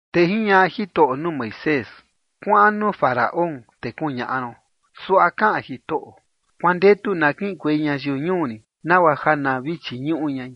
te jiñaꞌa Jitoꞌo nuu Moisés: ―Kuaꞌan nuu Faraón te kuñaꞌa ron: “Suaꞌa kaꞌan Jitoꞌo: Kuandetu na kiꞌinkuei ñayiu ñuu rin nagua ja na vi chiñuꞌu ñai.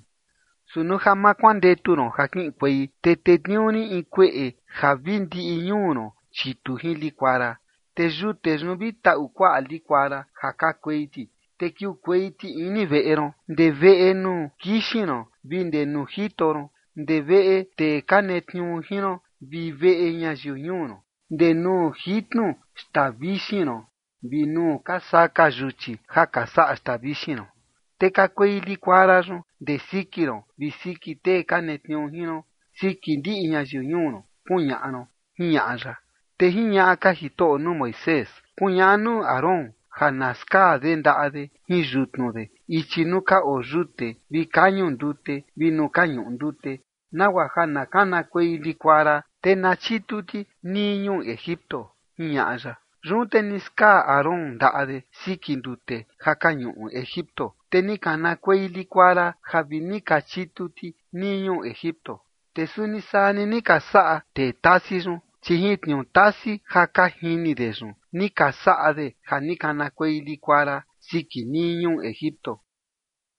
Su nuu ja ma kuandetu ron ja kiꞌinkuei, te tetniuu rin in kueꞌe ja vi ndiꞌi ñuu ron chitu jin likuara. Te yute yun vi taꞌu kuaꞌa likuara ja kakuei ti, te kiukuei ti ini veꞌe ron, ndee veꞌe nuu kixin ron vi ndee nuu jito ron, ndee veꞌe tee ka netniuu jin ron vi veꞌe ñayiu ñuu ron, ndee nuu jitnu xtaa vixin ron vi nuu ka saka yuchi ja ka saꞌa xtaa vixin ron. Te kakuei likuara yun ndee siki ron vi siki tee ka netniuu jin ron, siki ndiꞌi ñayiu ñuu ron”, kuñaꞌa ron ―jiñaꞌa ya. Te jiñaꞌa ka Jitoꞌo nuu Moisés: ―Kuñaꞌa nuu Aarón ja na skaa de ndaꞌa de jin yutnu de ichi nuu ka oo yute vi kañu ndute vi nuu ka ñuꞌu ndute, nagua ja na kanakuei likuara, te na chitu ti nii ñuu Egipto ―jiñaꞌa ya. Yun te ni skaa Aarón ndaꞌa de siki ndute ja ka ñuꞌu Egipto, te ni kanakuei likuara ja vi ni ka chitu ti nii ñuu Egipto. Te suni saa ni ni ka saꞌa tee tasi yun, chi jin tniuu tasi ja ka jini de yun ni ka saꞌa de ja ni kanakuei likuara siki nii ñuu Egipto.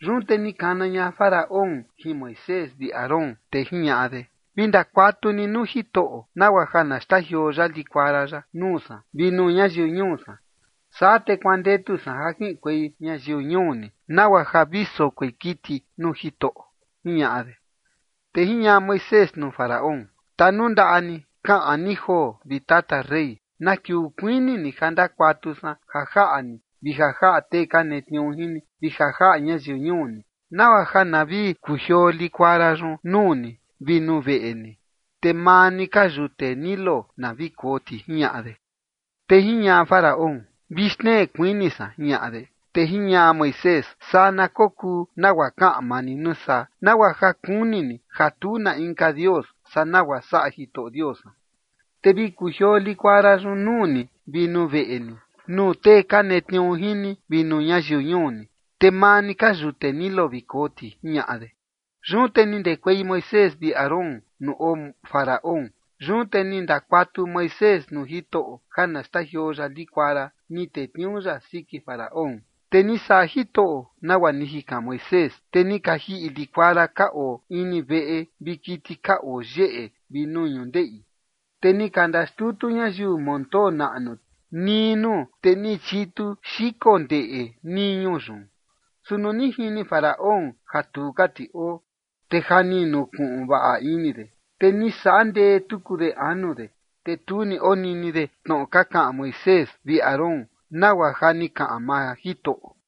Yun te ni kana ña Faraón jin Moisés vi Aarón, te jiñaꞌa de: ―Vi ndakuatu ni nuu Jitoꞌo nagua ja na xtajioo ya likuara yaꞌa nuu san vi nuu ñayiu ñuu san, saa te kuandetu san ja kiꞌinkuei ñayiu ñuu ni, nagua ja vi sokoi kiti nuu Jitoꞌo ―jiñaꞌa de. Te jiñaꞌa Moisés nuu Faraón: ―Tanundaꞌa ni, kaꞌan ni joo, vi tata rey, na kiuu kuini ni ja ndakuatu san ja jaꞌa ni vi ja jaꞌa tee ka netniuu jin ni, vi ja jaꞌa ñayiu ñuu ni, nagua ja na vi kujioo likuara yun nuu ni vi nuu veꞌe ni, te maa ni ka yute Nilo na vi koo ti ―jiñaꞌa de. Te jiñaꞌa Faraón: ―Vi xtnee kuini san ―jiñaꞌa de. Te jiñaꞌa Moisés: ―Saa na kokuu, nagua kaꞌan maa ni nuu saa, nagua ja kuni ni ja tu na inka Dios saꞌa nagua saꞌa Jitoꞌo Dios san. Te vi kujioo likuara yun nuu ni vi nuu veꞌe ni, nuu tee ka netniuu jin ni, vi nuu ñayiu ñuu ni, te maa ni ka yute Nilo vi koo ti ―jiñaꞌa de. Yun te ni ndekuei Moisés vi Aarón nuu oo Faraón. Yun te ni ndakuatu Moisés nuu Jitoꞌo ja na xtajioo ya likuara ni tetniuu ya siki Faraón. Te ni saꞌa Jitoꞌo nagua ni jikan Moisés, te ni ka jiꞌi likuara ja ka oo ini veꞌe vi kiti ka oo yeꞌe vi nuu ñundeꞌi. Te ni ka xtutu ñayiu montoo naꞌnu ti nii nuu, te ni chitu xiko ndeꞌe nii ñuu yun. Su nuu ni jini Faraón ja tu ka ti oo, te ja ni nukuꞌun vaꞌa ini de, te ni saꞌa ndee tuku de anu de, te tu ni onini de tnoꞌo ka kaꞌan Moisés vi Aarón, nagua ja ni kaꞌan maa Jitoꞌo.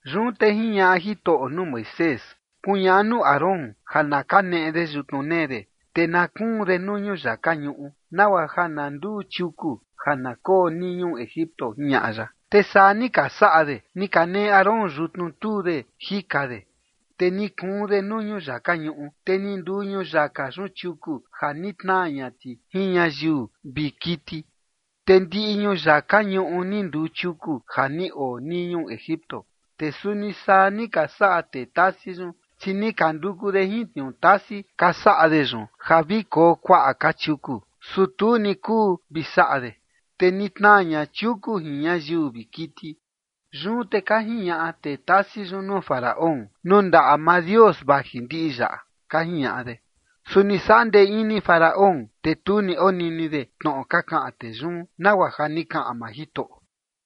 Yun te jiñaꞌa Jitoꞌo nuu Moisés: ―Kuñaꞌa nuu Aarón ja na kaneꞌe de yutnu nee de, te na kuun de nuu ñuyaka ñuꞌu, nagua ja na nduu chiuku ja na koo nii ñuu Egipto ―jiñaꞌa ya. Te saa ni ka saꞌa de. Ni kaneꞌe Aarón yutnu tuu de jika de, te ni kuun de nuu ñuyaka ñuꞌu, te ni nduu ñuyaka yun chiuku ja ni tnaa ña ti jin ñayiu vi kiti. Te ndiꞌi ñuyaka ñuꞌu ni nduu chiuku ja ni oo nii ñuu Egipto. Te suni saa ni ka saꞌa tee tasi yun, chi ni ka nduku de jin tniuu tasi ka saꞌa de yun ja vi koo kuaꞌa ka chiuku, su tu ni kuu vi saꞌa de. Te ni tnaa ña chiuku jin ñayiu vi kiti. Yun te ka jiñaꞌa tee tasi yun nuu Faraón: ―Nuu ndaꞌa maa Dios vaji ndiꞌi yaꞌa ―ka jiñaꞌa de. Su ni saꞌa ndee ini Faraón, te tu ni onini de tnoꞌo ka kaꞌan tee yun, nagua ja ni kaꞌan maa Jitoꞌo.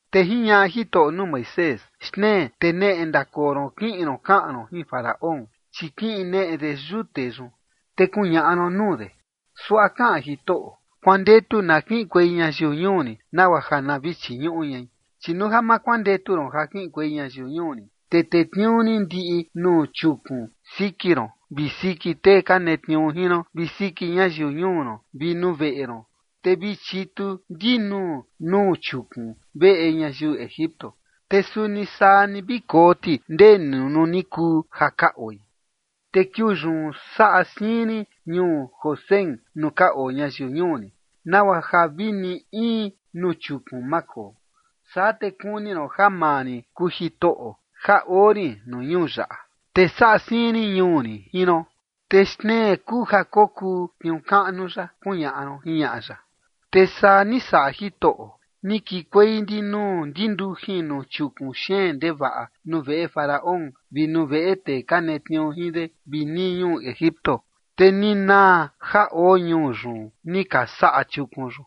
Te jiñaꞌa Jitoꞌo nuu Moisés: ―Xtnee te neꞌe ndakoo ron kiꞌin ron kaꞌan ron jin Faraón, chi kiꞌin neꞌe de yute yun, te kuñaꞌa ron nuu de: “Suaꞌa kaꞌan Jitoꞌo: Kuandetu na kiꞌinkuei ñayiu ñuu rin nagua ja na vi chiñuꞌu ñai. Chi nuu ja ma kuandetu ron ja kiꞌinkuei ñayiu ñuu rin, te tetniuu rin ndiꞌi nuu chiukun siki ron vi siki tee ka netniuu jin ron vi siki ñayiu ñuu ron vi nuu veꞌe ron, te vi chitu ndinuu nuu chiukun veꞌe ñayiu Egipto, te suni saa ni vi koo ti ndee ni nuu ni kuu ja ka oi. Te kiuu yun saꞌa siin rin ñuu Gosén nuu ka oo ñayiu ñuu rin, nagua ja vi ni in nuu chiukun ma koo. Saa te kuni ron ja maa rin kuu Jitoꞌo ja oo rin nuu ñuu yaꞌa. Te saꞌa siin rin ñuu rin jin ron. Te xtnee kuu ja kokuu tniuu kaꞌnu yaꞌa”, kuñaꞌa ron ―jiñaꞌa ya. Te saa ni saꞌa Jitoꞌo. Ni kikuei ndinuu ndindujin nuu chiukun xeen ndevaꞌa nuu veꞌe Faraón vi nuu veꞌe tee ka netniuu jin de vi nii ñuu Egipto, te ni naa ja oo ñuu yun ni ka saꞌa chiukun yun.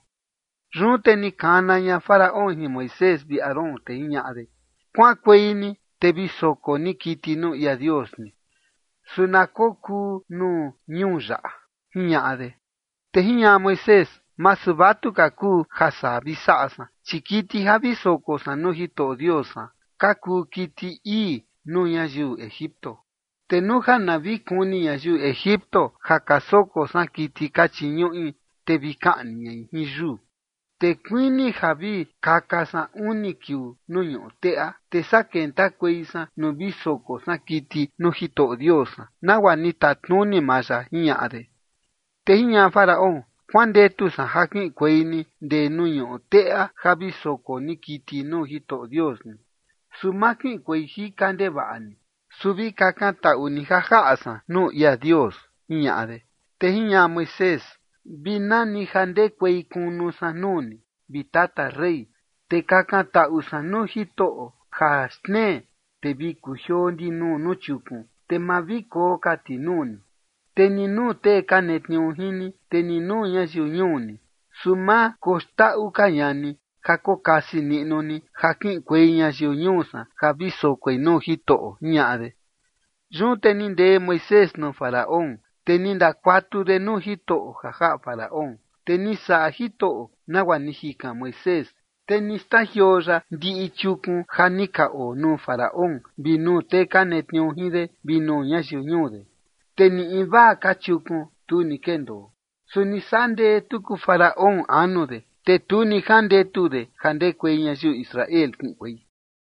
Yun te ni kana ña Faraón jin Moisés vi Aarón, te jiñaꞌa de: ―Kuaꞌankuei ni te vi soko ni kiti nuu ia Dios ni, su na kokuu nuu ñuu yaꞌa ―jiñaꞌa de. Te jiñaꞌa Moisés: ―Masu vatuka kuu ja saa vi saꞌa san, chi kiti ja vi soko san nuu Jitoꞌo Dios san ka kuu kiti ii nuu ñayiu Egipto. Te nuu ja na vi kuni ñayiu Egipto ja ka soko san kiti ka chiñuꞌi, te vi kaꞌni ñai jin yuu. Te kuini ja vi kaka san uni kiuu nuu ñuꞌu teꞌa, te saa kentakuei san nuu vi soko san kiti nuu Jitoꞌo Dios san, nagua ni tatnuni maa ya ―jiñaꞌa de. Te jiñaꞌa Faraón: ―Kuandetu san ja kiꞌinkuei ni ndee nuu ñuꞌu teꞌa ja vi soko ni kiti nuu Jitoꞌo Dios ni, su ma kiꞌinkuei jika ndevaꞌa ni. Su vi kakantaꞌu ni ja jaꞌa san nuu ia Dios ―jiñaꞌa de. Te jiñaꞌa Moisés: ―Vi nani ja ndekuei kunu san nuu ni, vi tata rey, te kakantaꞌu san nuu Jitoꞌo ja xtnee, te vi kujioo ndinuu nuu chiukun, te ma vi koo ka ti nuu ni, te ni nuu tee ka netniuu jin ni, te ni nuu ñayiu ñuu ni. Su ma koxndaꞌu ka ña ni ja kokasi niꞌnu ni ja kiꞌinkuei ñayiu ñuu san ja vi sokoi nuu Jitoꞌo ―jiñaꞌa de. Yun te ni ndee Moisés nuu Faraón, te ni ndakuatu de nuu Jitoꞌo ja jaꞌa Faraón. Te ni saꞌa Jitoꞌo nagua ni jikan Moisés, te ni xtajioo ya ndiꞌi chiukun ja ni ka oo nuu Faraón vi nuu tee ka netniuu jin de vi nuu ñayiu ñuu de. Te ni invaa ka chiukun, tu ni kendoo. Su ni saꞌa ndee tuku Faraón anu de, te tu ni jandetu de ja ndekuei ñayiu Israel kiꞌinkuei.